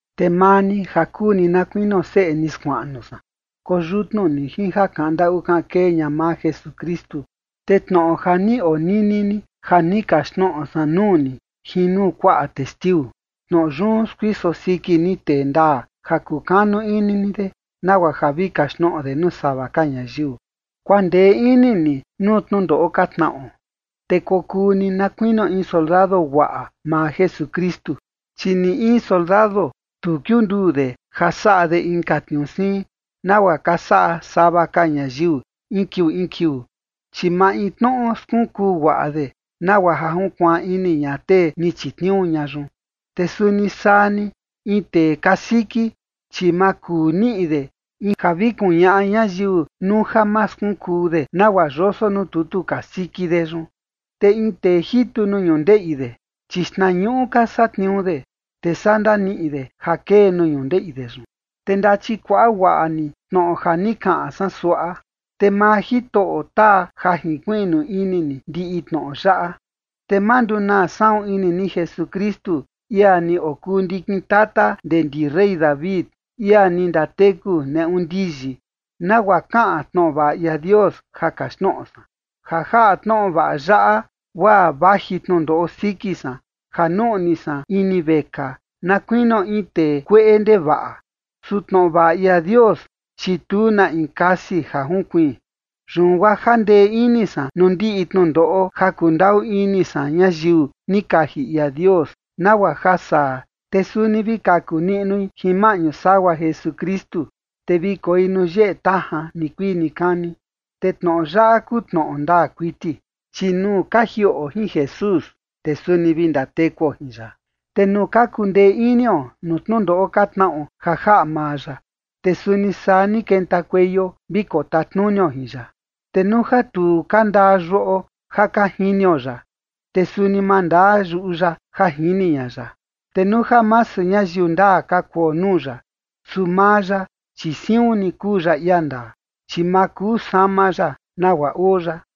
Te maa ni ja kuu ni na kuinio seꞌe ni skuaꞌnu san, koyutnu ni jin ja kaꞌan ndaꞌu kaꞌan kee ña maa Jesukristu. Te tnoꞌo ja ni onini ni ja ni kaxtnoꞌo san nuu ni jin nuu kuaꞌa testiu, tnoꞌo yun skuiso siki ni tee ndaa ja kukanu ini ni de, nagua ja vi kaxtnoꞌo de nuu sava ka ñayiu. Kuandee ini ni nuu tnundoꞌo ka tnaꞌo, te kokuu ni na kuinio in soldado guaꞌa maa Jesukristu. Chi ni in soldado, tu kiunduu de ja saꞌa de inka tniuu siin, nagua ka saꞌa sava ka ñayiu in kiuu in kiuu, chi maintnoꞌo skunkuu guaꞌa de nagua ja junkuaan ini ña tee ni chitniuu ña yun. Te suni saa ni, in tee kasiki, chi ma kuu niꞌi de in ja vi kuñaꞌa ñayiu nuu ja ma skunkuu de nagua yoso nuu tutu kasiki de yun. Te in tee jitu nuu ñundeꞌi de, chi xtnañuꞌu ka satniuu de, te saa ndaniꞌi de ja kee nuu ñundeꞌi de yun. Te ndachikuaꞌa guaꞌa ni tnoꞌo ja ni kaꞌan san suaꞌa, te maa Jitoꞌo taa ja jinkuiꞌnu ini ni ndiꞌi tnoꞌo yaꞌa. Te ma ndunaa saꞌun ini ni Jesukristu, ia ni okuu ndikin tata ndee ndi rey David, ia ni ndateku neꞌu ndiyi, nagua kaꞌan tnoꞌo vaꞌa ia Dios ja kaxtnoꞌo san. Ja jaꞌa tnoꞌo vaꞌa yaꞌa guaa vaji tnundoꞌo siki san ja nuꞌni san ini vekaa na kuinio in tee kueꞌe ndevaꞌa. Su tnoꞌo vaꞌa ia Dios, chi tu na in kasi ja junkuiin. Yun guaa jandee ini san nuu ndiꞌi tnundoꞌo ja kundaꞌu ini san ñayiu ni kaji ia Dios, nagua ja saa, te suni vi kaku niꞌnui jin maꞌñu sagua Jesukristu, te vi koi nuu yeꞌe tajan nikuii nikani. Te tnoꞌo yaꞌa kuu tnoꞌo ndaa kuiti: Chi nuu ka jiꞌo jin Jesús, te suni vi ndatekuo jin ya. Te nuu ka kundee inio nuu tnundoꞌo ka tnaꞌo ja jaꞌa maa ya, te suni saa ni kentakueio vi kotatnunio jin ya. Te nuu ja tu ka ndaa yuꞌo ja ka jinio ya, te suni ma ndaa yuꞌu ya ja jini ña ya. Te nuu ja masu ñayiu ndaa ka kuo nuu ya, su maa ya, chi siun ni kuu ya ia ndaa, chi ma kuu sama ya nagua oo ya.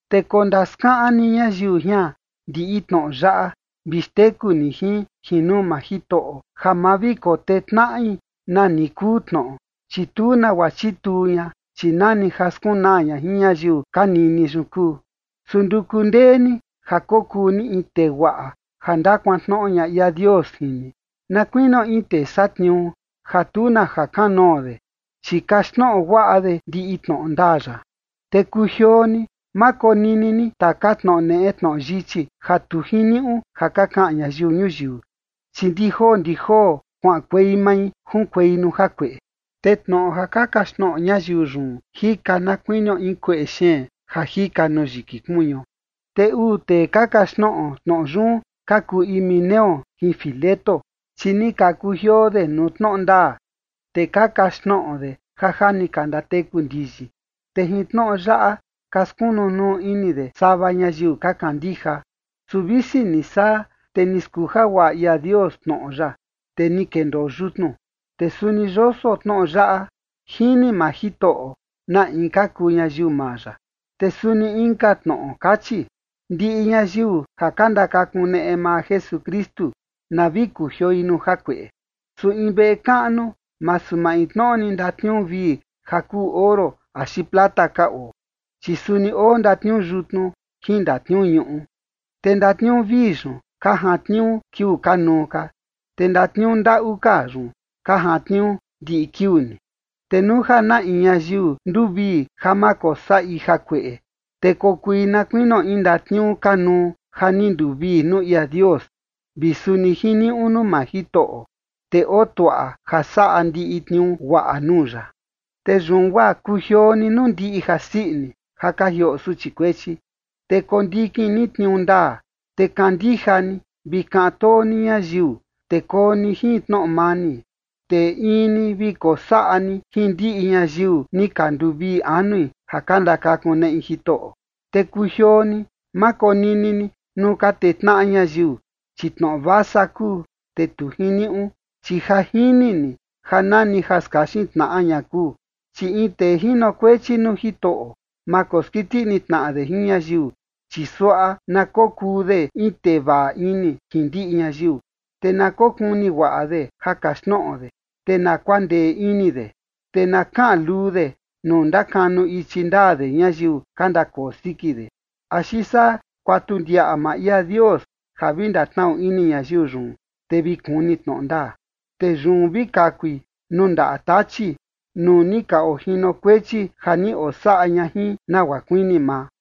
Te kondaskaꞌan ni ñayiu jian ndiꞌi tnoꞌo yaꞌa vi xteku ni jin, jin nuu maa Jitoꞌo, ja ma vi kotee tnaꞌi nani kuu tnoꞌo, chi tu nagua chituu ña, chi nani ja skunaa ña jin ñayiu ka nini yun kuu. Su nduku ndee ni ja kokuu ni in tee guaꞌa ja ndakuantnoꞌo ia Dios jin ni, na kuinio in tee satniuu ja tu na jakanoo de, chi kaxtnoꞌo guaꞌa de ndiꞌi tnoꞌo ndaa ya. Te kujioo ni, ma konini ni taka tnoꞌo neꞌe tnoꞌo yichi ja tu jiniuꞌu ja ka kaꞌan ñayiu ñuyiu, chi ndi joo ndi joo kuaꞌankuei mai junkuei nuu jakueꞌe. Te tnoꞌo ja ka kaxtnoꞌo ñayiu yun jika na kuinio in kueꞌe xeen ja jika nuu yiki kuñuo. Te uu tee ka kaxtnoꞌo tnoꞌo yun ka kuu Himeneo jin Fileto. Chi ni ka kujioo de nuu tnoꞌo ndaa, te ka kaxtnoꞌo de ja ja ni ka ndateku ndiyi, te jin tnoꞌo yaꞌa ka skunu nuu ini de sava ñayiu ka kandija. Su visi ni saa, te ni skuja guaꞌa ia Dios tnoꞌo ya, te ni kendoo yutnu, te suni yoso tnoꞌo yaꞌa: Jini maa Jitoꞌo na in ka kuu ñayiu maa ya. Te suni inka tnoꞌo kachi: Ndiꞌi ñayiu ja ka ndakakuneꞌe maa Jesukristu na vi kujioi nuu jakueꞌe. Su in veꞌe kaꞌnu masu maintnoꞌo ni ndatniuu vii ja kuu oro axi plata ka oo, chi suni oo ndatniuu yutnu jin ndatniuu ñuꞌu. Te ndatniuu vii yun ka jantniuu kiuu kanuu ka, te ndatniuu ndaꞌu ka yun ka jantniuu ndiꞌi kiuu ni. Te nuu ja na in ñayiu nduvii ja ma kosaꞌi jakueꞌe, te kokui na kuinio in ndatniuu kanuu ja ni nduvii nuu ia Dios, vi suni jiniuꞌu nuu maa Jitoꞌo, te oo tuaꞌa ja saꞌa ndiꞌi tniuu guaꞌa nuu ya. Te yun guaa kujioo ni nuu ndiꞌi jasii ini ja ka jioꞌo suchi kuechi, te kondikin ni tniuu ndaa, te kandija ni, vi kaꞌan too ni ñayiu, te koo ni jin tnoꞌo mani. Te in ni vi kosaꞌa ni jin ndiꞌi ñayiu ni ka nduvii anui ja ka ndakakuneꞌi Jitoꞌo. Te kujioo ni, ma konini ni nuu ka tee tnaꞌa ñayiu, chi tnoꞌo vasa kuu, te tu jiniuꞌu, chi ja jini ni ja nani ja skaxin tnaꞌa ña kuu. Chi in tee jinokuechi nuu Jitoꞌo, ma koskiti ini tnaꞌa de jin ñayiu, chi suaꞌa na kokuu de in tee vaꞌa ini jin ndiꞌi ñayiu, te na kokuni guaꞌa de ja kaxtnoꞌo de, te na kuandee ini de. Te na kaꞌan luu de nuu ndakanu ichi ndaa de ñayiu ka ndakoo siki de, axi saa kuatu ndiaꞌa maa ia Dios ja vi ndatnaꞌu ini ñayiu yun, te vi kuni tnoꞌo ndaa. Te yun vi kakui nuu ndaꞌa Tachi nuu ni ka ojinokuechi ja ni osaꞌa ña jin nagua kuini maa.